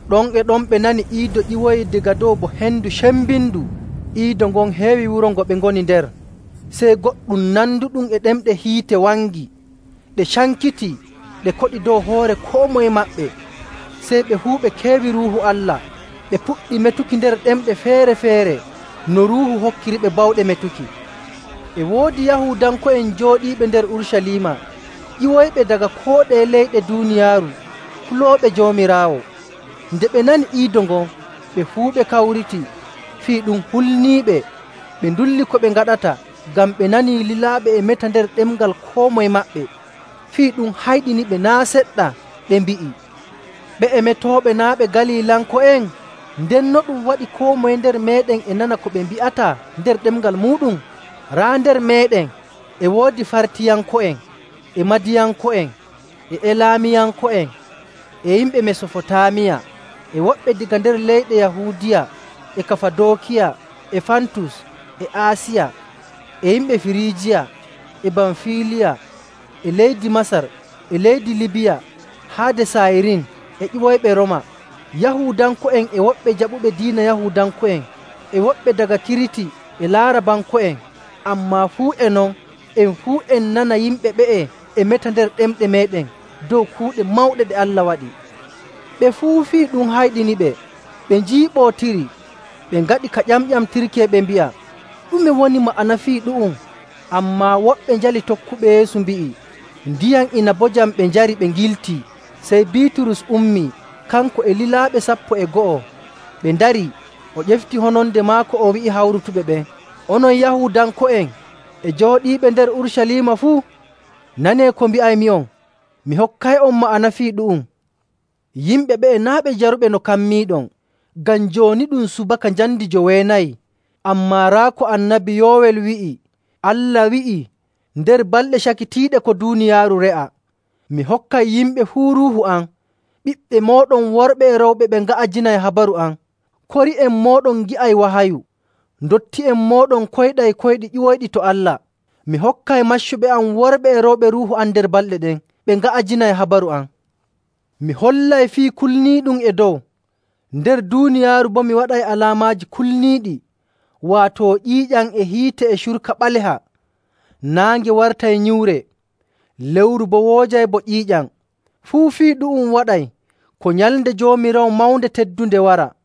Ɗon e ɗon ɓe nani iido ƴiwoyii daga dow bo hendu cembindu. Iido ngon heewi wuro ngo ɓe ngoni nder. Sey goɗɗum nanduɗum e ɗemɗe hiite wangi. Ɗe cankitii, ɗe koɗi dow hoore koo moye maɓɓe. Sey ɓe fuu ɓe keewi Ruuhu Allah, ɓe puɗɗi metuki nder ɗemɗe feere‑feere no Ruuhu hokkiriɓe bawɗe metuki. E woodi Yahuudanko'en jooɗiiɓe nder Urucaliima ƴiwoyɓe daga koo ɗeye leyɗe duuniyaaru kulooɓe Joomiraawo. Nde ɓe nani iido ngon, ɓe fuu ɓe kawriti. Fii ɗum hulniiɓe, ɓe ndulli ko ɓe ngaɗata, ngam ɓe nanii lilaaɓe e meta nder ɗemngal koo moye maɓɓe. Fii ɗum hayɗiniɓe naa' seɗɗa, ɓe mbi'i, “Ɓe'e metooɓe naa' ɓe Galilanko'en? Nden no ɗum waɗi koo moye nder meeɗen e nana ko ɓe mbi'ata nder ɗemngal muuɗum? Raa nder meeɗen e woodi Fartiyanko'en e Madiyanko'en e Elaamiyanko'en, e yimɓe Mesofotaamiya, e woɓɓe daga nder leyɗe Yahuudiya e Kafadookiya e Fantus e Aasiya, e yimɓe Firiijiya e Bamfiiliya e leydi Masar e leydi Libiya haade Saayirin e ƴiwoyɓe Rooma, Yahuudanko'en e woɓɓe jaɓuɓe diina Yahuudanko'en, e woɓɓe daga Kiriti, e Laarabanko'en. Ammaa fuu e non, en fuu en nana yimɓe ɓe'e e meta nder ɗemɗe meeɗen dow kuuɗe mawɗe ɗe Allah waɗi!” Ɓe fuu fii ɗum hayɗiniɓe, ɓe njiiɓootiri, ɓe ngaɗi ka ƴamƴamtirki, e ɓe mbi'a, “Ɗume woni ma'ana fii ɗu'um?” Ammaa woɓɓe njali tokkuɓe Yeesu mbi'i, “Ndiyam inabojam ɓe njari, ɓe ngiltii!” Sey Biiturus ummii, kanko e lilaaɓe sappo e go'o, ɓe ndarii, o ƴefti hononde maako, o wi'i hawrutuɓe ɓen, “Onon Yahuudanko'en e jooɗiiɓe nder Urucaliima fuu, nanee ko mbi'aymi'on. Mi hokkay'on ma'ana fii ɗu'um. Yimɓe ɓe'e naa' ɓe jaruɓe no kammiiɗon, ngam jooni ɗum subaka njamndi joweenayi! Ammaa raa ko Annabi Yowel wi'i Allah wi'ii, ‘Nder balɗe cakitiiɗe ko duuniyaaru re'a, mi hokkay yimɓe fuu Ruuhu am. Ɓiɓɓe mooɗon worɓe e rewɓe ɓe nga'ajinay habaru am, kori'en mooɗon ngi'ay wahayu, ndotti'en mooɗon koyɗay koyɗi ƴiwoyɗi to Allah. Mi hokkay maccuɓe am worɓe e rewɓe Ruuhu am nder balɗe ɗen, ɓe nga'ajinay habaru am. Mi hollay fii kulniiɗum e dow; nder duuniyaaru boo mi waɗay alaamaaji kulniiɗi, waato ƴiiƴam e hiite e curka ɓaleha. Naange wartay nyiwre, lewru boo woojay bo ƴiiƴam. Fuu fii ɗu'um waɗay ko nyalnde Joomiraawo mawnde teddunde wara.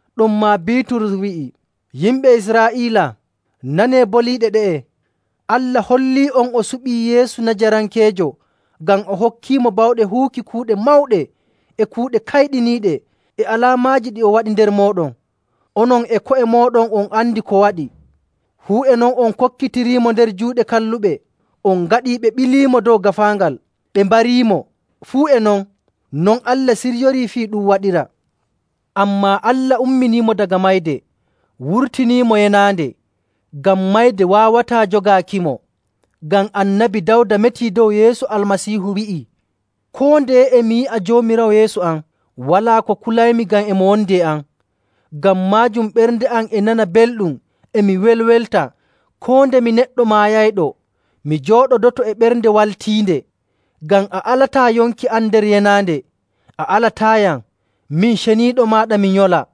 Ɗonmaa Biiturus wi'i, “Yimɓe Israa'iila, nanee boliiɗe ɗe'e: Allah hollii'on o suɓii Yeesu Najarankeejo ngam o hokkiimo bawɗe huwuki kuuɗe mawɗe e kuuɗe kayɗiniiɗe e alaamaaji ɗi o waɗi nder mooɗon. Onon e ko'e mooɗon on andi ko waɗi. Fuu e non on kokkitiriimo nder juuɗe kalluɓe. On ngaɗii ɓe ɓiliimo dow gaafaangal, ɓe mbarimo. Fuu e non, non Allah siryorii fii ɗum waɗira.. Ammaa Allah umminiimo daga mayde, wurtiniimo yenaande, ngam mayde waawataa jogaakimo.. Ngam Annabi Dawda metii dow Yeesu Almasiihu wi'ii, ‘Koo ndeye e mi yi'a Joomiraawo yeeso am, walaa ko kulaymi ngam e mo wondi e am. Ngam maajum ɓernde am e nana belɗum e mi welwelta, koo nde mi neɗɗo maayayɗo mi jooɗodoto e ɓernde waaltiinde, ngam a alataa yonki am nder yenaande, a alataayam, min ceniiɗo maaɗa mi nyola.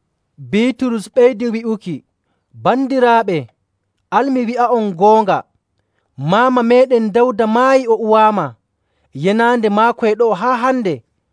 Biiturus ɓeydii wi'uki, “Bandiraaɓe, al mi wi'a'on goonga. Maama meeɗen Dawda maayii o uwaama, yenaande maako e ɗo'o haa hande.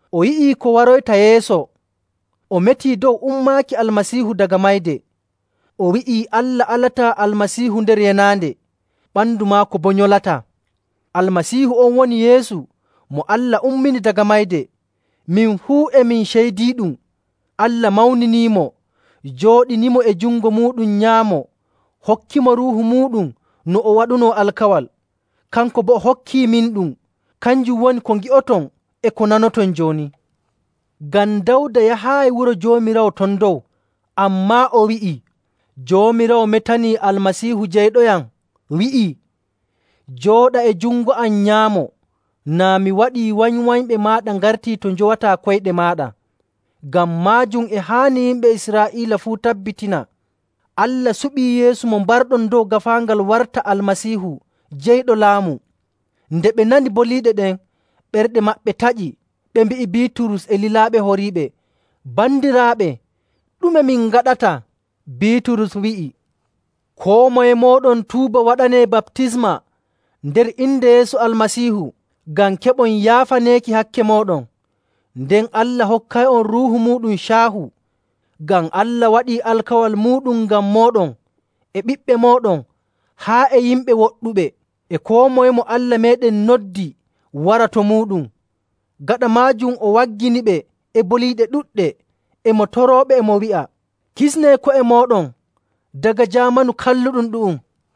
O yi'ii ko waroyta yeeso, o metii dow ummaaki Almasiihu daga mayde. O wi'ii Allah alataa Almasiihu nder yenaande, ɓandu maako boo nyolataa. Almasiihu on woni Yeesu mo Allah ummini daga mayde. Min fuu e min ceydiiɗum. Allah mawniniimo, jooɗiniimo e jungo muuɗum nyaamo hokkimo Ruuhu muuɗum no o waɗunoo alkawal. Kanko boo o hokkiiminɗum. Kanjum woni ko ngi'oton e ko nanoton jooni. Ngam Dawda yahaayi wuro Joomiraawo ton dow, ammaa o wi'ii, ‘Joomiraawo metanii Almasiihu Jeyɗoyam, wi'ii, Jooɗa e jungo am nyaamo, naa mi waɗii wanywanyɓe maaɗa ngartii to njowataa koyɗe maaɗa.’. “Ngam maajum e haani yimɓe Israa'iila fuu tabbitina Allah suɓii Yeesu mo mbarɗon dow gaafaangal warta Almasiihu Jeyɗo Laamu.” Nde ɓe nani boliiɗe ɗen, ɓerɗe maɓɓe taƴi, ɓe mbi'i Biiturus e lilaaɓe horiiɓe, “Bandiraaɓe, ɗume min ngaɗata?” Biiturus wi'i, “Koo moye mooɗon tuuba waɗanee baptisma nder inde Yeesu Almasiihu ngam keɓon yaafaneeki hakke mooɗon. Nden Allah hokkay'on Ruuhu muuɗum caahu. Ngam Allah waɗii alkawal muuɗum ngam mooɗon, e ɓiɓɓe mooɗon haa e yimɓe woɗɗuɓe, e koo moye mo Allah meeɗen noddi wara to muuɗum.” Gaɗa maajum o wagginiɓe e boliiɗe ɗuɗɗe, e mo torooɓe, e mo wi'a, “Kisnee ko'e mooɗon daga jaamanu kalluɗum ɗu'um!”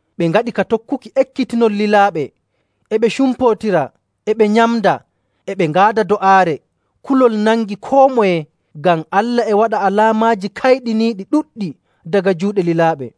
Ɓe ngaɗi ka tokkuki ekkitinol lilaaɓe, e ɓe cumpootira, e ɓe nyamda, e ɓe ngaada do'aare. Kulol nangi koo moye, ngam Allah e waɗa alaamaaji kayɗiniiɗi ɗuɗɗi daga juuɗe lilaaɓe.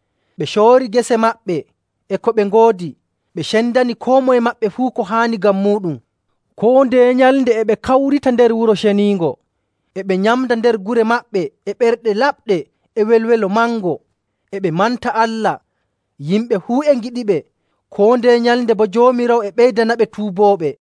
Ɓe coori gese maɓɓe e ko ɓe ngoodi, ɓe cendani koo moye maɓɓe fuu ko haani ngam muuɗum. Koo ndeye nyalnde e ɓe kawrita nder Wuro Ceniingo. E ɓe nyamda nder gure maɓɓe e ɓerɗe laɓɗe e welwelo mango, e ɓe manta Allah. Yimɓe fuu e ngiɗiɓe. Koo ndeye nyalnde boo Joomiraawo e ɓeydanaɓe tuubooɓe.